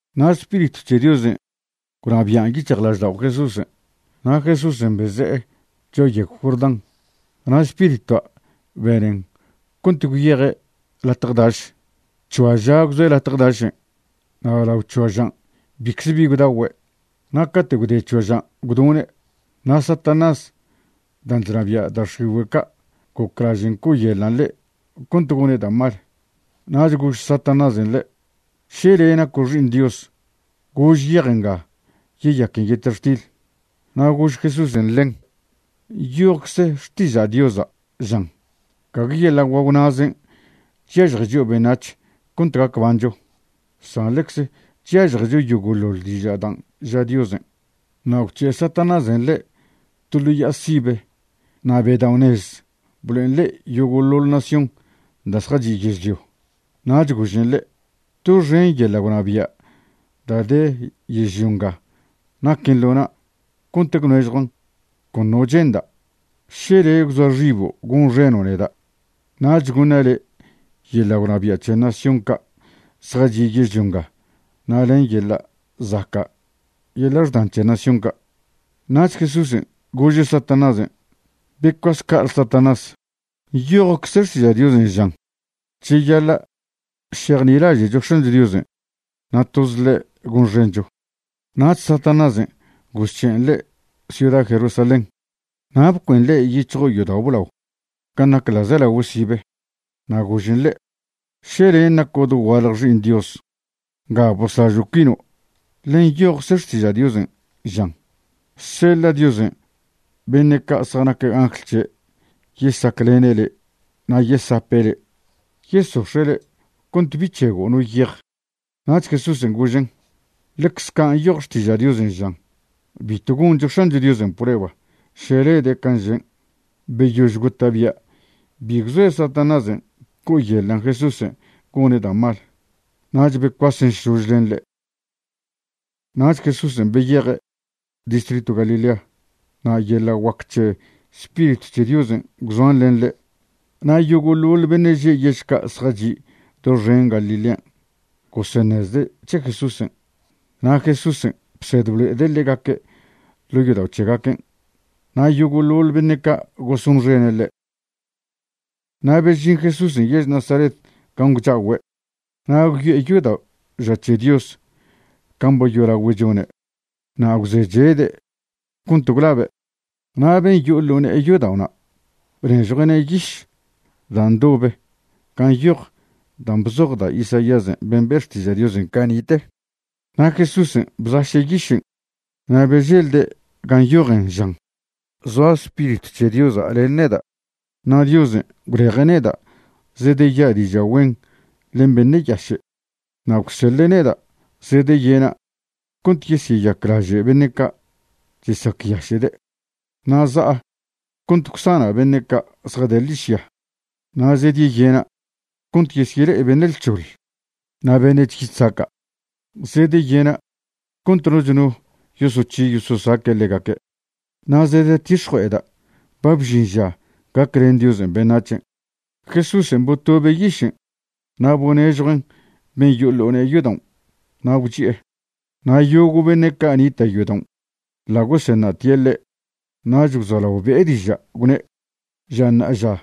Na' Spiritw c̱he Diosen' gwnabian' yic̱hjlaždao' Jesúsen'. Na' Jesúsen' beze'e cho'a yegw Jordán, na' Spiritua' benen cont gwyeje' latje daš. C̱hoa ža gwzoe' latje dašen' na' lao c̱hoa žan' bicze bi gwdagüe'. Na' cate' gwde c̱hoa žan' gwdone'. Na' Satanás dan' chnabia' da' x̱igüe' ca' goclažen' co'oyeḻan' ḻe' cont gone' da' mal. Nach gož Satanásen' ḻe': ―Še le' naco' Xi'iṉ Dios, gož yej nga yeyaquen yetextil. Na' gož Jesúsen' ḻen: ―Nyojcze Xtiža' Diosa' žan: “Gague yeḻa' guagw na'zen' chyažje chio' beṉac̱h cont gac bancho, san ḻecze chyažjecho yogo'ḻoḻ diža' dan' ža Diosen'.” Na' gwc̱he' Satanásen' ḻe' to ḻo ya'a sibe na' bedao'nez blo'en ḻe' yogo'ḻoḻ nación da' zjachi' yežlio. Nach gožen ḻe': ―Doxen yeḻa' gwnabia' da' de yežlio nga naquen ḻo na' cont gwnežjuan' con no che'nda'. Še le' gwzoa xibo' gonxeno' neda', nach goṉa' le' yeḻa' gwnabia' c̱he nación ca' zjachi' yežlio nga na' len yeḻa' zaca' yeḻa' xdan c̱he nación ca'. Nach Jesúsen' gože' Satanásen': ―Becuas ca'ale Satanás. Nyojcze Xtiža' Diosen' žan: “Cheyaḻa' šejnilaže'cho X̱ancho Diosen' na' toz ḻe' gonxencho.” Nach Satanásen' gozc̱he'en ḻe' ciuda Jerusalén. Na' bcuen ḻe' yic̱hjo' yodao' blao gan' nac ḻa'zelagüe sibe, na' gožen ḻe': ―Še len' naco' dogualje Xi'iṉ Dios, nga boslažo' cuino', ḻe nyojcze Xtiža' Diosen', žan: Seḻa' Diosen' beṉe' ca' zjanac angl c̱he' yesaclene' le' na' yesape' le', yesox̱e' le' cont bi c̱hego' no yej. Nach Jesúsen' gožen': ―Ḻecz ca' nyoj Xtiža' Diosen' žan: “Bitw goncho X̱ancho Diosen' prueba še lede' can' žen'.” Beyož gota'bia' bi gwzoe Satanásen' co'oyeḻan' Jesúsen' gone' da' mal, nach becuasen šlož len ḻe'. Nach Jesúsen' beyeje' distritw Galilea, na' yeḻa' guac c̱he Spiritw c̱he Diosen' gwzoan len ḻe'. Na' yogo'ḻoḻ beṉe' že' yež ca' zjachi' doxen Galilea goseṉezde' c̱he Jesúsen'. Na' Jesúsen' bsed blo'ede' ḻegaque' ḻo' yodao' c̱hegaquen', na' yogo'ḻoḻ beṉe' ca' gosonxene' ḻe'. Na' bežin Jesúsen' yež Nazaret gan' gwcha'ogüe', na' gwyo'e yodao' ža c̱he Dios can' ba yolagüe' chone', na' gwzechede' cont gwlabe'. Na' ben' yo'o ḻo ne'e yodao'na' bnežjue'ne' yiš da' ndobe gan' nyoj dan' bzoj da' Isaías ben' be' Xtiža' Diosen' cani'te. Na' Jesúsen' bzaše' yišen' na' beželde' ga nyojen žan: Zoa Spiritw c̱he Diosa' len neda', na' Diosen' gwleje' neda' zedeya' diža' güen len beṉe' yaše'. Na' gwseḻe' neda' zedeyena' cont yesyeyaclaže' beṉe' ca' chesacyaše'de'. Na' za'a cont gwsana' beṉe' ca' zjade ḻižya. Na' zedeyena' cont yesyele'e beṉe' lc̱hoḻ. Na' beṉe' chyi chzaca', zedeyena' cont noch no yosoc̱hi yososaque' ḻegaque'. Na' zedetix̱jue'eda' ba bžin ža gaclen Diosen' beṉac̱hen'. Jesúsen' botobe' yišen' na' bonežjuen' ben' yo'o ḻo ne'e yodaon' na' gwchi'e. Na' yogo' beṉe' ca' nita' yodaon' ḻa' goseṉa'tie' ḻe'. Nach gwzolao be'e diža' gwne': ―Ža ṉa'aža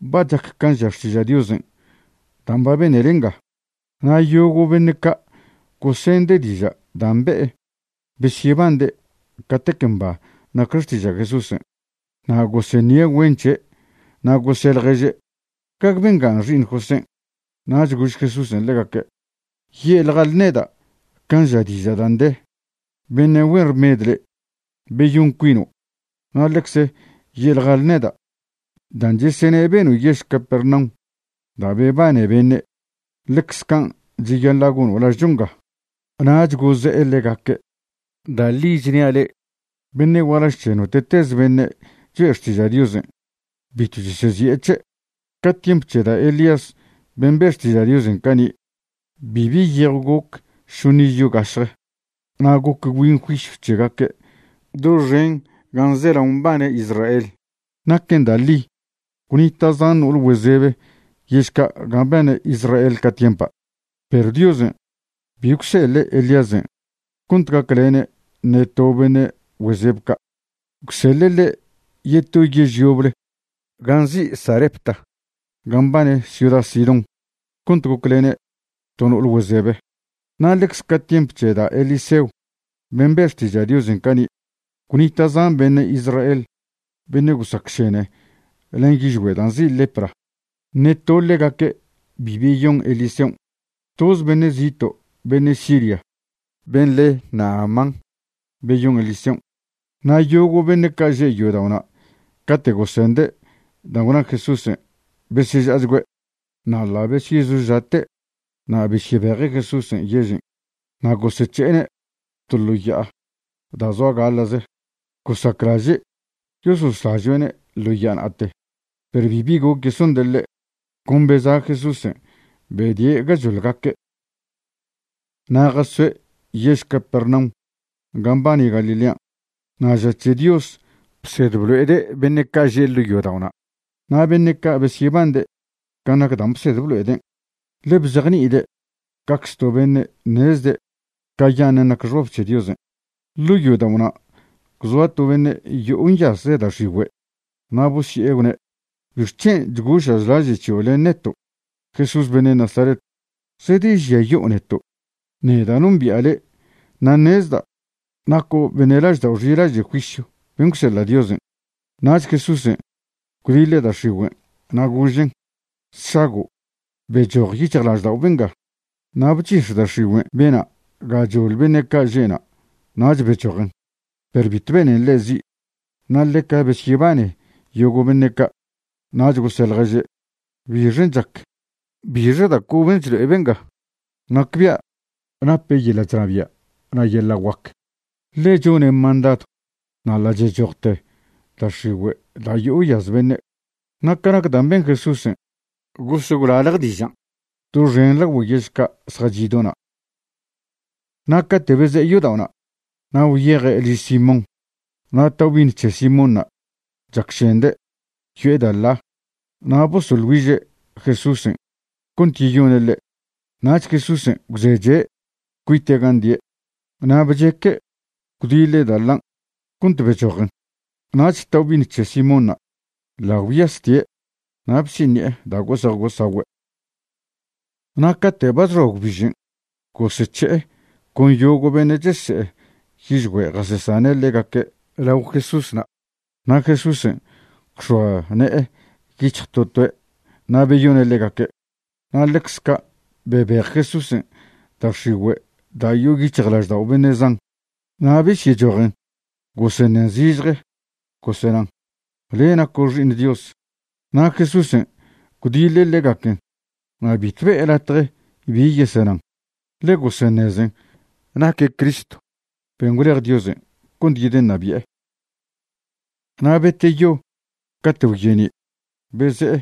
ba chac can' ža Xtiža' Diosen' dan' ba benele nga. Na' yogo' beṉe' ca' gosende' diža' dan' be'e besyebande' catec mba nac xtiža' Jesúsen'. Na' goseṉie' güen c̱he' na' gose' ḻježe': ―¿Gague benga xi'iṉ Josén'? Nach gož Jesúsen' ḻegaque': ―Ye'ḻjale neda' can' ža diža' dan' de: “Beṉe' güen rmed le', beyon cuino'.” Na' ḻecze ye'ḻjale neda': “Dan' chesene' beno' yež Capernaum da' bebane beṉe', ḻecz can' cheyaḻa' gono' lažcho nga.” Nach goze'e ḻegaque': ―Da' ḻi chnia' le'e, beṉe' gualaž c̱he note'teze beṉe' choe' xtiža' Diosen' bitw chesezi'e c̱he'. Ca tiemp c̱he da' Elías ben' be' xtiža' Diosen' cani', bibi yejw goc šoṉ iz yo gašje na' goc gwbin juisyw c̱hegaque' doxen gan' zelao mbane Israel. Naquen da' ḻi gwnita' zan no'ol güezebe yež ca' gan' mbane Israel ca tiempa', perw Diosen' bi gwseḻe' Elíasen' cont gaclene' ṉe to beṉe' güezeb ca'. Gwseḻe' ḻe' yeto yež yoble gan' nzi' Sarepta gan' mbane ciuda Sidón cont goclene' to no'ol güezebe. Na' ḻecz ca' tiemp c̱he da' Eliseo ben' be' xtiža' Diosen' cani', gwnita' zan beṉe' Israel beṉe' gosacšene len yižgüe' da' nzi' lepra. Ṉe to ḻegaque' bi beyon Eliseon'. Toz beṉe' zito' beṉe' Siria, ben' le' Naamán, beyon Eliseon'. Na' yogo' beṉe' ca' že' yodao'na' cate' gosende' dan' gwna Jesúsen' beseža'achgüe'. Na' ḻa' besyezoža'te' na' besyebeje' Jesúsen' yežen', na' gosec̱he'ene' to ḻo ya'a da' zoa gaḻa'ze, gosaclaže' yososlažoe'ne' ḻo ya'a na'ate, perw bibi goc yesonde' ḻe'. Con beza' Jesúsen' bedie' gachoḻ gaque'. Na' jasoe' yež Capernaum gan' mbane Galilean', na' ža c̱he Dios bsed blo'ede' beṉe' ca' že' ḻo' yodao'na'. Na' beṉe' ca' besyebande' ca nac dan' bsed blo'eden', ḻe bzejni'ide' cacze to beṉe' ṉezde' cayaṉen' nac xbab c̱he Diosen'. Ḻo' yodao'na' gwzoa to beṉe' yo'o nyaze' da' x̱igüen'. Na' bosye'e gwne': ―¿Bixc̱hen' chgoša' chlaže' c̱hio' len neto', Jesús beṉe' Nazaret? ¿Zedežiayo'o neto'? Neda' nombi'a le' na' ṉezda' naco' beṉe' laždao' xilaže' juisyw ben' gwseḻa' Diosen'. Nach Jesúsen' gwdiḻe' da' x̱igüen' na' gožen': ―¡Sšago'! Bechoj yic̱hjlaždao' benga. Na' bchix̱ da' x̱igüen' bena' gachoḻ beṉe' ca' že'na' nach bechojen. Perw bitw benen ḻe' zi'. Na' ḻeca besyebane yogo' beṉe' ca', nach gose' ḻježe': ―¿Bixen' chac? ¿Bixe da' coben' chlo'e benga? Nacbia' nape' yeḻa' chnabia' na' yeḻa' guac, ḻe chone' mandadw na' ḻa' chechojte da' x̱igüe' da' yo'o nyaz beṉe'. Na' ca nac dan' ben Jesúsen' gos gwlalje dižan' doxen lagüe yež ca' zjachi' do na'. Na' cate' beze'e yodao'na', na' gwyeje' liž Simón. Na' taobi'iṉ c̱he Simónṉa' chacšende', yo'e da' ḻa. Na' bosoḻ güiže' Jesúsen' cont yeyone' ḻe'. Na' Jesúsen' gwzeche' cuite' gan' die', na' bcheque' gwdiḻe' da' ḻan' cont bechojen. Nach taobi'iṉ c̱he Simónṉa' ḻa' gwyastie' na' bsiṉi'e da' gose'ej gosagüe'. Na' cate' ba chxoa gwbižen' gosec̱he'e con yogo' beṉe' chese'e yižgüe' jasesane' ḻegaque' lao Jesúsna'. Na' Jesúsen' gwx̱oa ne'e yic̱hj to toe' na' beyone' ḻegaque'. Na' ḻecz ca' bebej Jesúsen' da' x̱igüe' da' yo'o yic̱hjlaždao' beṉe' zan. Na' besyechojen goseṉen zižje, gosenan: ―Le' naco' Xi'iṉ Dios. Na' Jesúsen' gwdiḻe' ḻegaquen na' bitw be'e latje bi yesenan, ḻe goseṉezen naque' Cristo ben' gwlej Diosen' cont yedeṉabi'e. Na' beteyo cate' gwye'ni', beze'e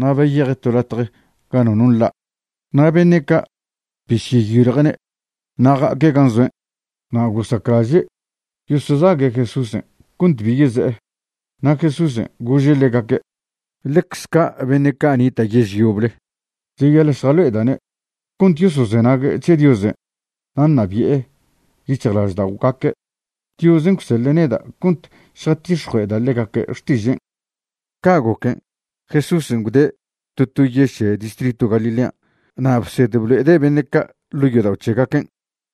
na' beyeje' to latje ga nono nḻa'. Na' beṉe' ca' besyeyiljue'ne' na' ja'aque' gan' zoen'. Na' gosaclaže' yosozague' Jesúsen' cont bi yeze'e. Na' Jesúsen' gože' ḻegaque': ―Ḻecz ca' beṉe' ca' nita' yež yoble cheyaḻa' šjalo'eda'ne' cont yosozenague' c̱he Diosen' na' ṉabi'e yic̱hjlažda'ogaque'. Diosen' gwseḻe' neda' cont šjatix̱jue'eda' ḻegaque' xtižen'. Ca' goquen', Jesúsen' gwde' to to yež c̱he distritw Galilea na' bsed blo'ede' beṉe' ca' ḻo' yodao' c̱hegaquen'.